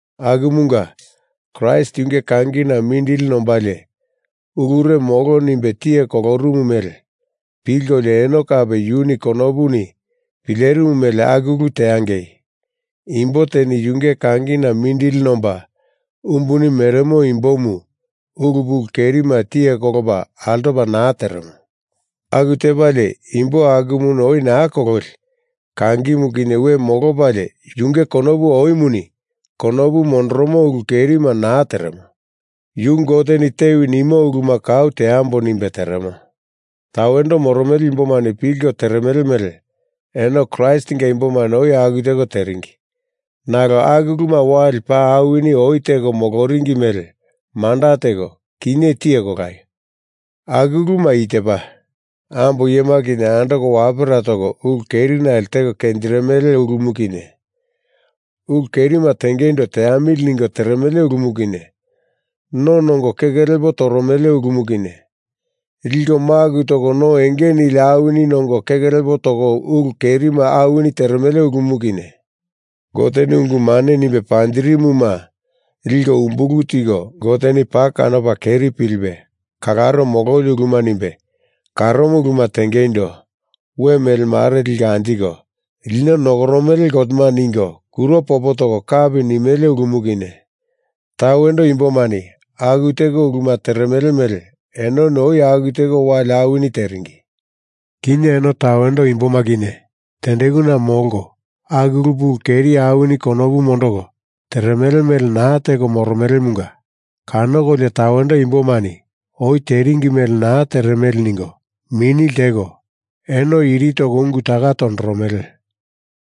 Akumunga, Kraist yunge kangina mindili nombalie ulure molo nimbe tiye kolorumu mele pilkolio eno kape yuni konopuni pilerimu mele aku ulu teangei. Imbo teni yunge kangina mindili nomba umbuni meremo imbomu ulu pulu kerima tiye kolopa altopa naa teremo. Aku tepalie imbo akumuni oi naa kololi, kangimu kinye we molopalie yunge konopu oimuni konopu mondoromo ulu kerima naa teremo. Yu Goteni tewi nimo uluma kau teambo nimbe teremo. Tawendo moromele imbomani pilko teremele mele eno Kraistinga imbomani oi aku teko teringi. Nalo aku uluma wali paa awini oi teko moloringi mele manda teko, kinye tiye kolaio. Aku uluma i tepa: Ambo iyema kinye andoko wapera toko ulu kerinale teko kenjirimele ulumu kinye, ulu kerima tengeindo teamili ningo teremele ulumu kinye, no nongo keke lepo toromele ulumu kinye, liko maku toko no enge nili awini nongo keke lepo toko ulu kerima awini teremele ulumu kinye, Goteni ungu mane nimbe panjirimuma liko umbulu tiko Goteni paa kanopa keri pilipe kalaro mololi uluma nimbe karomo uluma tengeindo we melemare liko anjiko lino nokoromele gotema ningo kuro popo toko kapi nimele ulumu kinye, tawendo imbomani aku teko uluma teremele mele enoni oi aku teko wali awini teringi. Kinye eno tawendo imboma kinye tendekuna molko aku ulu pulu keri awini konopu mondoko teremele mele naa teko moromelemunga kanokolio tawendo imbomani oi teringi mele naa teremele ningo mini lteko eno iri toko ungu taka tondoromele.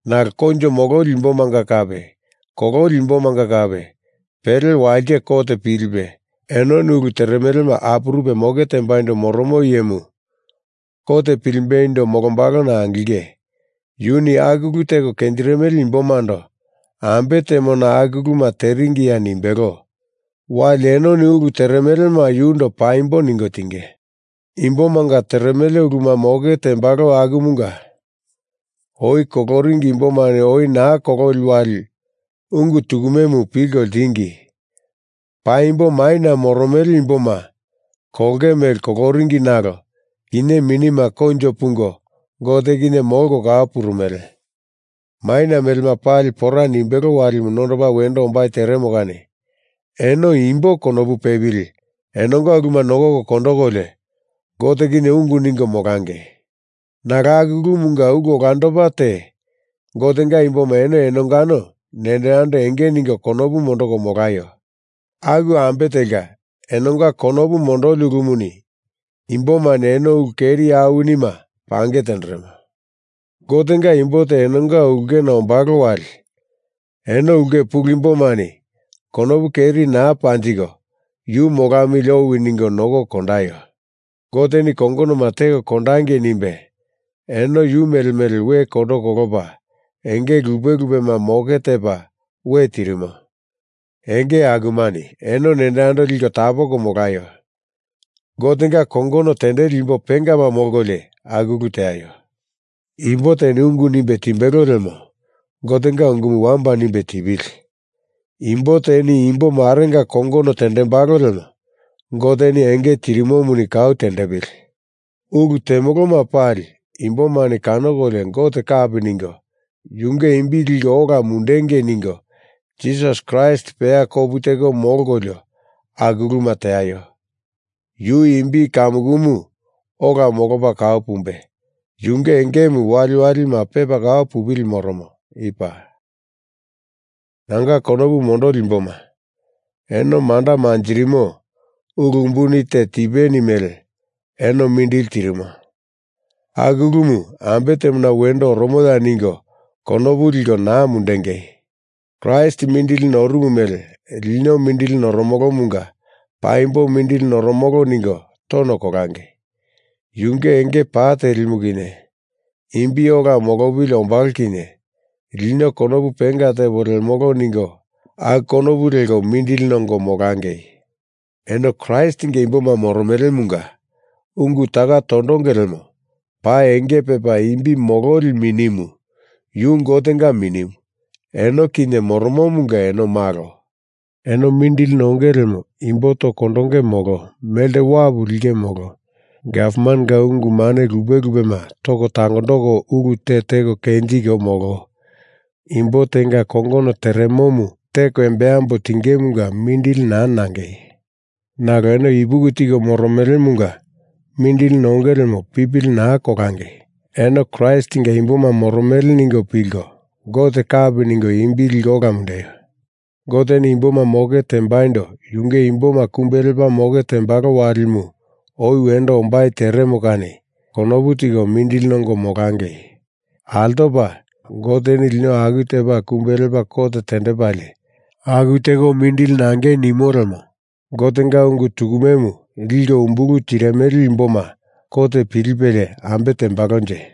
Nalo koinjo mololi imbomanga kape kololi imbomanga kape, pele walite kot pilipe, enoni ulu teremelema apurupe moke tembaindo moromo iyemu kot pilimbeindo molombalona angilinge. Yuni aku ulu teko kenjirimele imbomando ambe temona aku uluma teringiya nimbelo wali enoni ulu teremelema yundo paimbo ningo tinge. Imbomanga teremele uluma moke tembalo akumunga oi koloringi imbomani oi naa kololi wali ungu tukumemu pilko ltingi. Paimbo maina moromele imboma kolonge mele koloringi nalo kinye minima koinjo pungo Gote kinye molko kau purumele. Maina melema pali pora nimbelo walimu nondopa wendo ombai teremo kani eno imbo konopu pepili enonga uluma nokoko kondokolio, Gote kinye ungu ningo molangei. Nalo aku ulumanga ulu olandopa te Gotenga imboma eno enongano nendo yando enge ningo konopu mondoko molaio. Aku ambe telka enonga konopu mondoli ulumuni imbomani eno ulu keri awinima pange tenderemo. Gotenga imbo te enonga ulke tenga ombalo wali eno ulke pulu imbomani konopu keri naa panjiko yu molamili owi ningo nokoko kondaio. Goteni kongonoma teko kondangei nimbe eno yu mele mele we kondo kolopa enge lupe lupema moke tepa we tirimo. Enge akumani eno nendo yando liko tapondoko molaio. Gotenga kongono tendeli imbo pengama molkolio aku ulu teaio. Imbo teni ungu nimbe timbelo lemo Gotenga unguma wamba nimbe tipili. Imbo teni imbo marenga kongono tendembalo lemo Goteni enge tirimomuni kau tendepili. Ulu temoloma pali imbomani kanokolio Gote kapi ningo Yunge imbi liko ola mundengei ningo Jisas Kraist peya kopu teko molkolio aku uluma teaio. Yu imbi kamukumu ola molopa kau pumbe, yunge engemu waliwalima pepa kau pupili moromo. I paa. Nanga konopu mondoli imboma, eno manda manjirimo ulu umbuni te tipeni mele, eno mindili tirimo. Aku ulumu ambe temona wendo oromoya ningo konopu liko naa mundengei. Kraist mindili norumu mele lino mindili noromolomunga paimbo mindili noromolo ningo tono kolangei. Yunge enge pa telimu kinye imbi ola molopili ombalo kinye lino konopu penga tepo lemolo ningo aku konopu leko mindili nongo molangei. Eno Kraistinga imboma moromelemunga ungu taka tondonge lemo paa enge pepa imbi mololi Minimu, Yu Gotenga Minimu, eno kinye moromomunga eno malo. Eno mindili nonge lemo imbo toko kondonge molo melte wapu linge molo gavmanenga ungu mane lupe lupema toko tangondoko ulu te teko kenjinge molo imbo tenga kongono teremomu teko embambo tingemunga mindili naa nangei. Nalo eno ipuki tiko moromelemunga mindili nonge lemo pipili naa kolangei. Eno Kraistinga imboma moromele ningo pilko Gote kapi ningo imbi liko ola mundeio. Goteni imboma moke tembaindo yunge imboma kumbe lepa moke tembalo walimu oi wendo ombai teremo kani konopu tiko mindili nongo molangei. Altopa, Goteni lino aku tepa kumbe lepa kot tendepalie aku teko mindili nangei nimo lemo Gotenga ungu tukumemu liko umbulu tirimele imboma kot pilipelie, ambe tembalonje?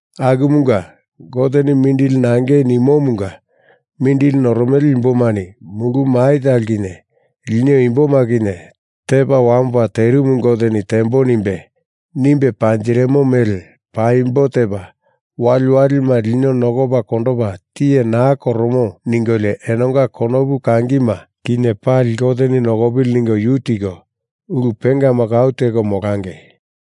Akumunga, Goteni mindili nangei nimomunga mindili noromele imbomani mulu mai talo kinye lino imboma kinye tepa wamopa terimu Goteni tembo nimbe, nimbe panjirimo mele paimbo tepa, waliwalima lino nokopa kondopa tiye naa koromo ningolio enonga konopu kangima kinye pali Goteni nokopili ningo yu tiko, ulu pengama kau teko molangei.